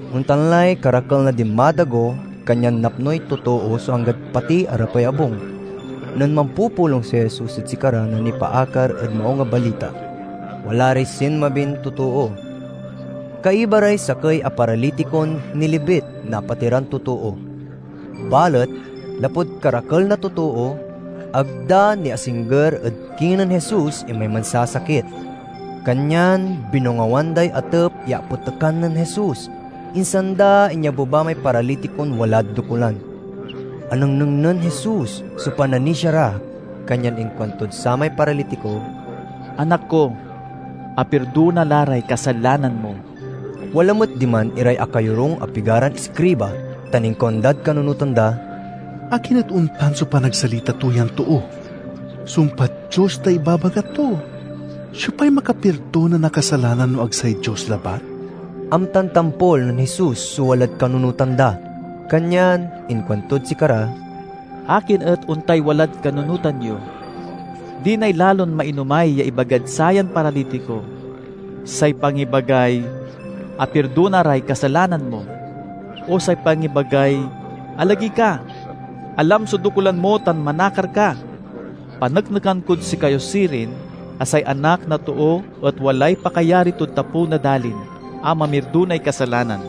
Ontan lay karakel na dinmadago, kanyan napnoy totoo so anggad pati arapay abung. Nen mampupulong si Jesus ed sikara na nipaakar ed Maung a Balita, wala ray sinmabin totoo. Kaiba ray sakey a paralitikon nilibit na apatiran totoo. Balet lapud karakel na totoo, ag da niasingger ed kinen Jesus imay mansasakit. Kanyan binongawan day atep ya apetekan nen Jesus, insan da inyabeba may paralitikon walad dokulan. Anengneng nen Jesus so pananisia ra, kanyan inkuantod samay paralitiko, "Anak ko, apirdona la ray kasalanan mo." Wala met diman iray akayorung a pigaran iskriba tan inkuandad kanunotan da, "Akin et ontan so panagsalita to yan too? Sumpad Dios tay ibabaga to! Siopay makapirdona na kasalanan no ag say Dios labat?" Amtan tampol nen Jesus so walad kanunotan da, kanyan inkuantod sikara, "Akin et ontay walad kanunotan yo? Dinay lalon mainomay ya ibagad sayan paralitiko: say pangibagay, 'Apirdona ray kasalanan mo,' o say pangibagay 'Alagey ka, alam so dokulan mo tan manakar ka'? Paneknekan kod sikayo sirin a say Anak na Too et walay pakayari tod tapew na dalin a mamirdonay kasalanan."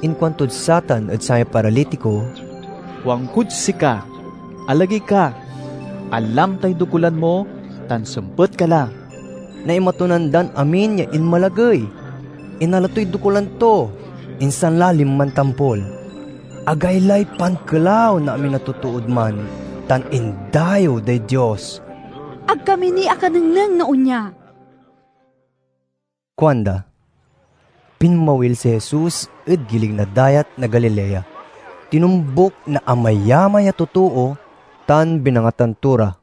Inkuantod satan ed samay paralitiko, "Kuankod sika, alagey ka, alam tay dokulan mo, tan sempet ka la!" Naimatonan dan amin ya inmalagey, inala toy dokulan to, insan la linman tampol. Agaylay pankelaw na amin a totood man tan indayew day Dios. "Ag kami ni akanengneng na onya!" kuanda. Pinmawil si Jesus ed gilig na Dayat na Galilea. Tinombuk na amayamay a totoo, tan binangatan to ra.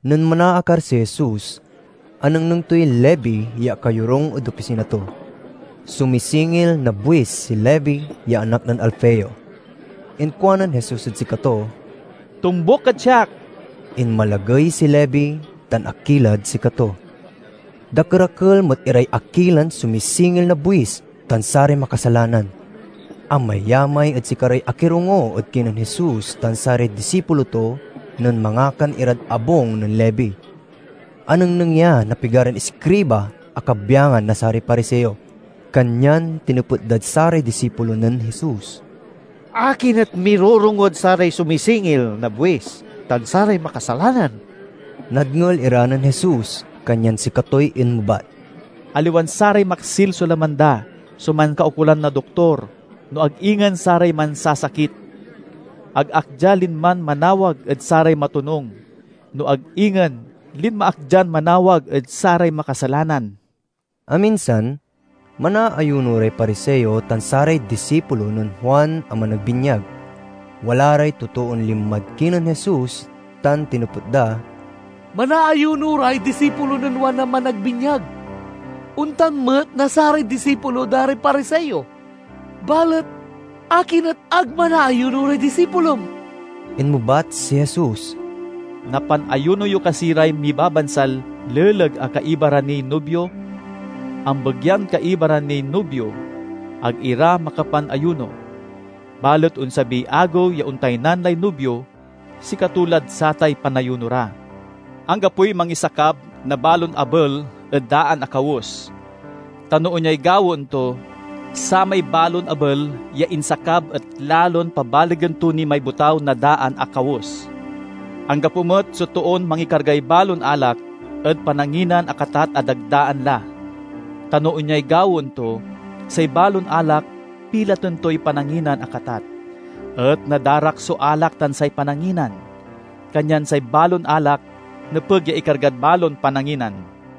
Nen manaakar si Jesus anengneng toy Levi ya akayorung ed opisina to. Sumisingil na buis si Levi ya anak nen Alfeo. Inkuanen Jesus ed sikato, "Tombuk kad siak." Inmalagey si Levi tan akilad sikato. Dakerakel met iray akilan sumisingil na buis tan saray makasalanan. Amayamay ed sikaray akirongo ed kinen Jesus tan saray disipulo to nen mangakan irad abung nen Levi. Anengneng ya na pigaran iskriba a kabyangan na saray Pariseo, kanyan tinepet dad saray disipulo nen Jesus, "Akin et mirorongod saray sumisingil na buis tan saray makasalanan?" Nadngel ira nen Jesus kanyan sikatoy inmebat, "Aliwan saray maksil so laman da so mankaukolan na doktor, no ag ingen saray mansasakit. Ag ak dia linman manawag ed saray matonung, no ag ingen linma ak dian manawag ed saray makasalanan." Aminsan, manaayuno ray Pariseo tan saray disipulo nen Juan a Managbinyag. Wala ray totoon linmad kinen Jesus tan tinepet da, "Manaayuno ray disipulo nen Juan a Managbinyag; ontan met na saray disipulo da ray Pariseo. Balet akin et ag manaayuno ray disipulom?" Inmebat si Jesus, "Napanayuno yo kasi ray mibabansal leleg a kaiba ra niy nubio? Ambegyan kaiba ra niy nubio, ag ira makapanayuno. Balet onsabiy agew ya ontaynan lay nubio; sikato lad satay panayuno ra. "Anggapoy mangisakab na balon abel ed daan a kawes. Ta no onyay gawaen to, samay balon abel ya insakab et lalon pabalegen to ni may botaw na daan a kawes. Anggapo met so toon mangikargay balon alak ed pananginan a katat a dagdaan la. Ta no onyay gawaen to, say balon alak pilaten toy pananginan a katat, et nadarak so alak tan say pananginan. Kanyan say balon alak nepeg ya ikargad balon pananginan!"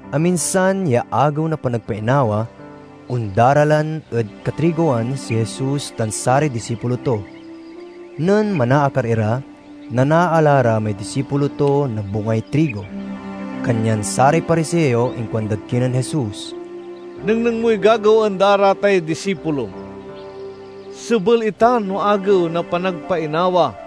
Aminsan ya Agew na Panagpainawa, ondaralan ed katrigowan si Jesus tan saray disipulo to. Nen manaakar ira, nanaala ra may disipulo to na bungay trigo. Kanyan saray Pariseo inkuandad kinen Jesus, "Nengneng moy gagawaen da ra tay disipulom. Sebel itan no Agew na Panagpainawa!"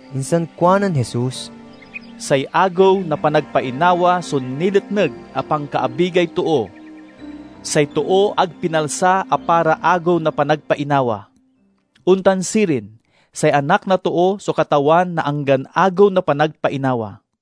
Insan kuanen Jesus, "Say Agew na Panagpainawa so niletneg a pankaabigay too; say too ag pinalsa a para Agew na Panagpainawa. Ontan sirin, say Anak na Too so Katawan na anggan Agew na Panagpainawa."